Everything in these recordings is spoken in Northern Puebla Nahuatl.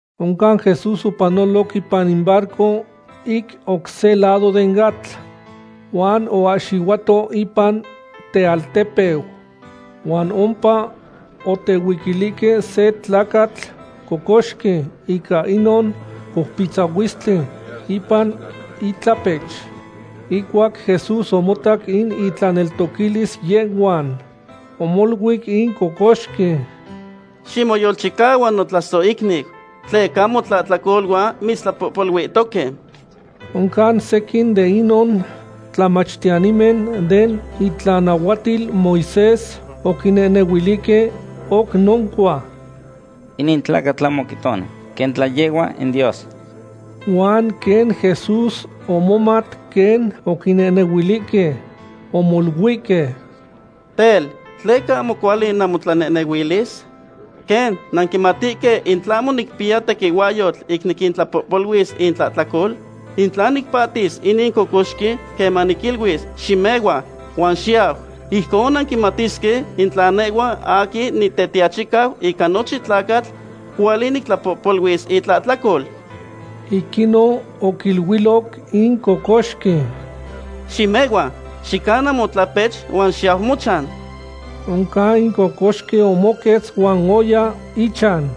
Oncan Jesús opanoloc ipan in barco ic oc se lado den atl, huan oahxihuato ipan tealtepeu. Huan ompa otehuiquilihque se tlacatl cocoxqui ica inon coupitzahuilistli ipan itlahpech. Ihcuac Jesús omotac in intlaneltoquilis yehhuan, omoluic in cocoxqui: ―Ximoyolchicahua notlasohicniu, tleca motlahtlacoluan mitztlapohpoluihtoque. Oncan sequin de inon tlamachtiyanimen den itlanahuatil Moisés oquinehnehuilihque oc noncua: “Inin tlacatl ahmo quihtoni quen tla yehhua in Dios.” Huan quen Jesús omomat quen oquinehnehuilihque, omoluihque: ―Tel, ¿tleca ahmo cuali namotlanehnehuilis? ¿Quen nanquimatihque in tlahmo nicpiya tequihuahyotl ic nictlapohpoluis itlahtlacol? In tla nicpahtis inin cocoxqui queman niquiluis: “Ximehua, huan xiyau”, ijcon nanquimatisque in tla nehhua aquin Nitetiachicau ica nochin tlacatl cuali nictlapohpoluis itlahtlacol. Ic inon oquiluiloc in cocoxqui: ―Ximehua, xicana motlapech huan xiyau mochan. Oncan in cocoxqui omoquetz huan oya ichan.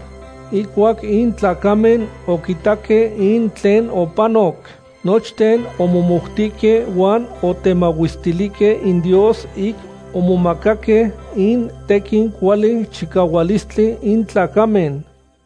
Ihcuac in tlacamen oquitaque in tlen opanoc, nochten omomoutihque huan otemahuestilihque in Dios ic omomacaque in tequin cuali chicahualistli in tlacamen.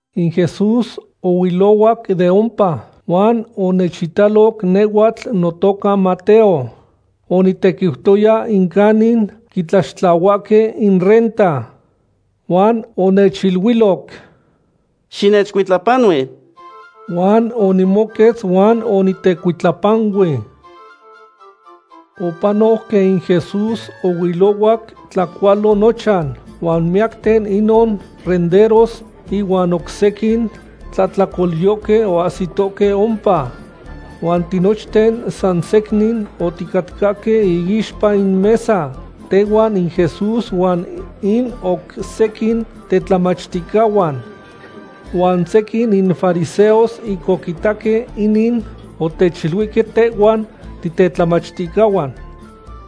In Jesús ohuilohuac de ompa, huan onechitaloc nehhuatl notoca Mateo. Onitequiutoya in canin quitlaxtlahuahque in renta. Huan onechiluiloc: ―Xinechcuitlapanui. Huan onimoquetz huan onitecuitlapanui. Opanoc quen in Jesús ohuilohuac tlacualo nochan, huan miyacten inon renderos ihuan oc sequin tlahtlacolyohque oahsitohque ompa. Huan tinochten san secnin oticatcahque iixpa in mesa, tehuan in Jesús huan in oc sequin tetlamachticahuan. Huan sequin in fariseos ic oquitaque inin, otechiluihque tehhuan titetlamachticahuan: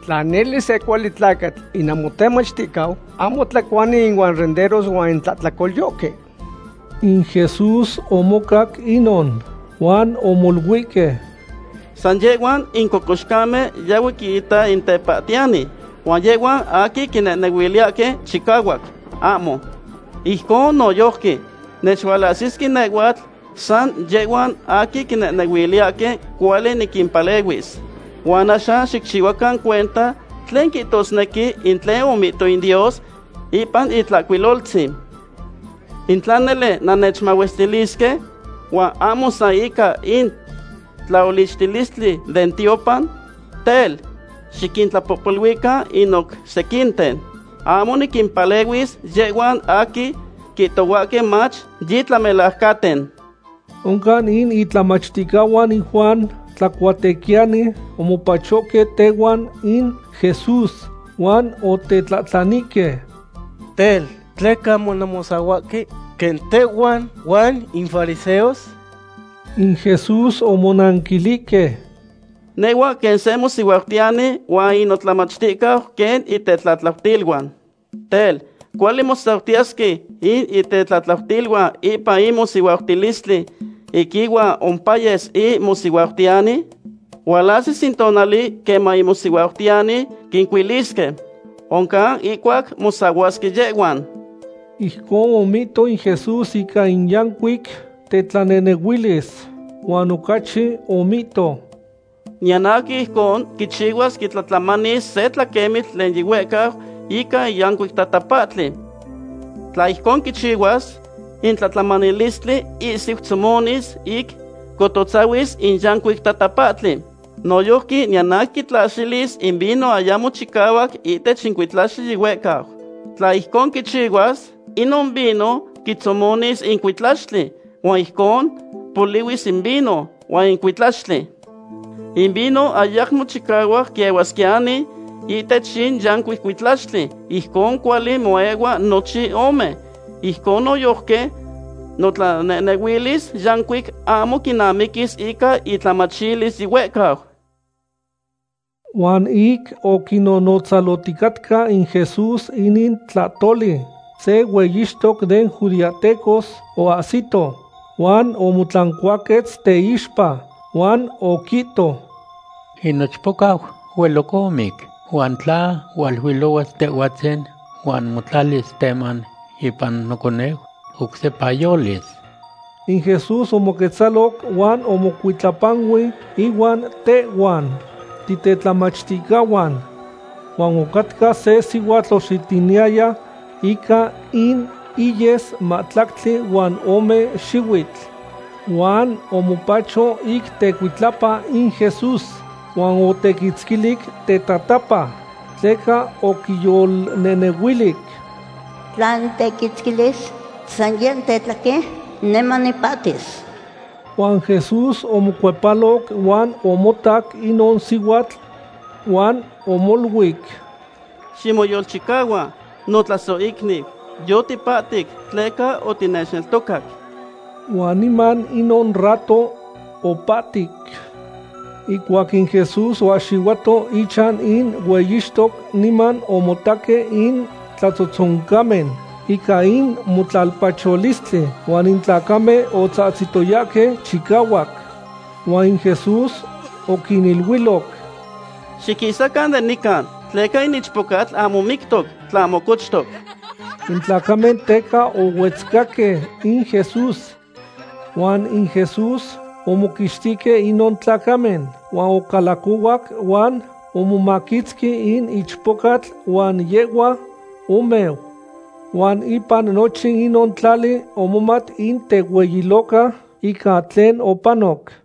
―Tla nele se cuali tlacatl in namotemachticau, ahmo tlacuani ihuan in renderos huan in tlahtlacolyohque. In Jesús omocac inon, huan omoluihque: ―San yehhuan in cocoxcamen yahue quita in tepahtiyani, huan yehhuan aquin quinehnehuiliyahque chicahuac, ahmo. Ijcon noyojqui, nechualahsisque nehhuatl san yehhuan aquin quinehnehuiliyahque cuali niquimpalehuis. Huan axan xicchihuacan cuenta tlen quihtosnequi in tlen omihto in Dios ipan in Itlahcuiloltzin: “In tla nele nannechmahuestilisque, huan ahmo san ica in tlaolichtilistli den tiopan, tel, xiquintlapohpoluican in oc sequinten.” Ahmo niquimpalehuis yehhuan aquin quihtohuahque mach yitlamelajcanten. Oncan in itlamachticahuan in Juan Tlacuatequiyani omopachohque tenahuac in Jesús, huan otetlahtlanihque: ―Tel, ¿tleca ahmo nanmosahuahque quen tehhuan huan in fariseos? In Jesús omonanquilihque: ―Nehhua quen se mosihuautiyani huan in notlamachticahun quen itetlatlautiluan. Tel, ¿cuali mosautiyesque in itetlatlautiluan ipan in mosihuautilistli ic ihuan ompayes in mosihuautiyani? Hualahsis in tonali queman in mosihuautiyani quincuilisque. Oncan ihcuac mosahuasque yehhuan. Ijcon omihto in Jesús ica in yancuic tetlanehnehuilis. Huan ocachi omihto: ―Niyan aquin ijcon quichihuas quitlatlamanis se tlaquemitl tlen yihuehcau ica in yancuic tatapahtli. Tla ijcon quichihuas, in tlatlamanilistli ihsiu tzomonis ic cototzahuis in yancuic tatapahtli. Noyojqui niyan aquin quitlaxilis in vino ayamo chicahuac ihtech in cuitlaxtli yihuehcau. Tla ijcon quichihuas, inon vino quitzomonis in cuitlaxtli, huan ijcon polihuis in vino huan in cuitlaxtli. In vino ayamo chicahuac quiehuasquiyani ihtech in yancuic cuitlaxtli. Ijcon cuali moehua nochin ome. Ijcon noyojqui notlanehnehuilis yancuic ahmo quinamiquis ica intlamachilis yihuehcau. Huan ic oquinnonotzaloticatca in Jesús inin tlahtoli, se hueyixtoc den judeahtecos oahsito, huan omotlancuaquetz teixpa, huan oquihto: ―In nochpocau hueloc omic, huan tla hualuilohuas Tehhuatzin huan motlalis teman ipan noconeu, oc sepa yolis. In Jesús omoquetzaloc huan omocuitlapanui inuan tehhuan titetlamachticahuan. Huan ocatca se sihuatl oxitiniyaya ica in iyes mahtlactli huan ome xihuitl. Huan omopacho ic tecuitlapa in Jesús, huan otequitzquilic tetatapa. Tleca oquiyolnehnehuilic: “Tla nitequitzquilis san yeh tetlaquen, niman nipahtis.” Huan Jesús omocuepaloc huan omotac inon sihuatl huan omoluic: ―Ximoyolchicahua, notlasohicniu; yotipahtic tleca otinechneltocac. Huan niman inon rato opahtic. Ihcuac in Jesús oahxihuato ichan in hueyixtoc, niman omotaque in tlatzotzoncamen ica in motlalpacholistli huan in tlacamen otzahtzitoyahque chicahuac. Huan in Jesús oquiniluiloc: ―Xiquisacan de nican, tleca in ichpocatl ahmo mictoc, tlahmo cochtoc. In tlacamen teca ohuetzcahque in Jesús. Huan in Jesús omoquixtihque inon tlacamen, huan ocalacohuac huan omomaquitzqui in ichpocatl huan yehhua omeu. Huan ipan nochin inon tlali omomat in tehueyiloca ica tlen opanoc.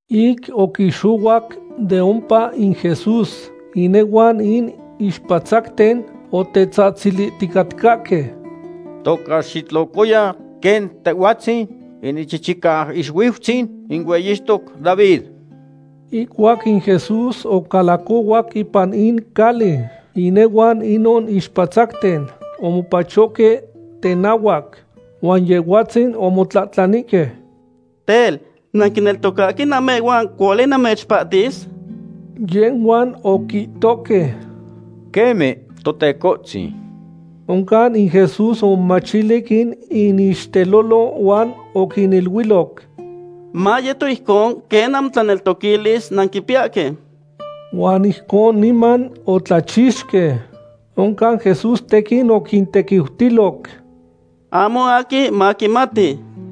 Ic oquixohuac de ompa in Jesús, inehuan in ixpatzacten otetzahtzilihticatcahque: ―¡Toca xitlocoya quen Tehhuatzin in Ichichicaixuiutzin in hueyixtoc David! Ihcuac in Jesús ocalacohuac ipan in cali, inehuan inon ixpatzacten omopachohque tenahuac, huan Yehhuatzin omotlahtlanihque: ―Tel, ¿nanquineltocahque namehhuan cuali namechpahtis? Yehhuan oquihtohque: ―Queme, Totecohtzin. Oncan in Jesús omomachilic in inixtelolo huan oquiniluiloc: ―Mayeto ijcon quen namotlaneltoquilis nanquipiyahque. Huan ijcon niman otlachixque. Oncan Jesús tequin oquintequiutiloc: ―Ahmo aquin maquimati.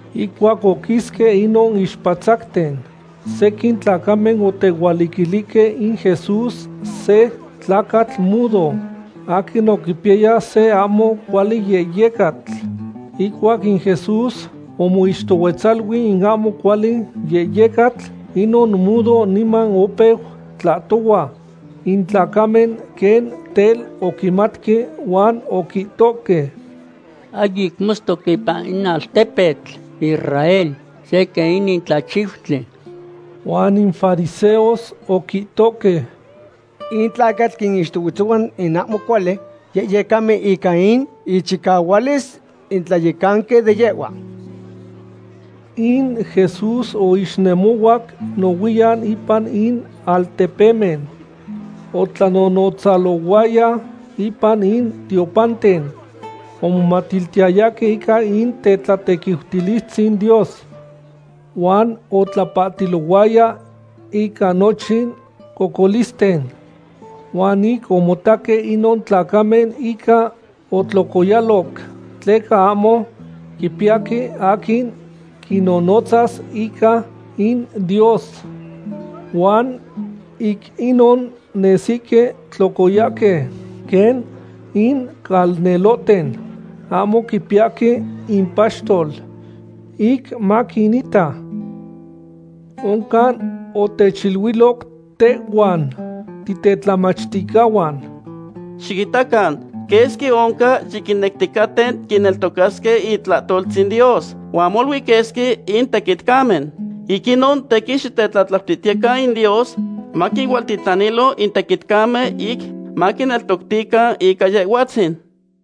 Ihcuac oquisque inon ixpatzacten, sequin tlacamen otehualiquilihque in Jesús se tlacatl mudo, aquin oquipiyaya se ahmo cuali yehyecatl. Ihcuac in Jesús omoixtohuetzalui in ahmo cuali yehyecatl, inon mudo niman opeu tlahtohua. In tlacamen quen tel oquimatque huan oquihtohque: ―Ahyic motztoc ipan in altepetl Israel se quen inin tlachiutli. Huan in fariseos oquihtohque: ―Inin tlacatl quinixtohuetzohua in ahmo cuali yehyecamen ica in ichicahualis in tlayecanqui de yehhuan. In Jesús oixnemohuac nohuiyan ipan in altepemen, otlanonotzalohuaya ipan in tiopanten. Omomatiltiyayahque ica in tetlatequiutilistzin Dios. Huan otlapahtilohuaya ica nochin cocolisten. Huan ic omotaque inon tlacamen, inca otlocoyaloc, tleca ahmo quipiyahque aquin quinnonotzas ica in Dios, huan ic inon nesihque tlocoyahque quen in calnelohten ahmo quipiyahque impaxtol ic maquinita. Oncan otechiluiloc tehhuan titetlamachticahuan: ―Xiquinitacan quesqui oncan yiquinecticaten quineltocasque itlahtoltzin Dios, huan molui quesqui in tequitcamen. Ic inon tequin xitetlatlautihtiyecan in Dios maquinualtitlanilo in tequitcamen ic maquineltoctican ica Yehhuatzin.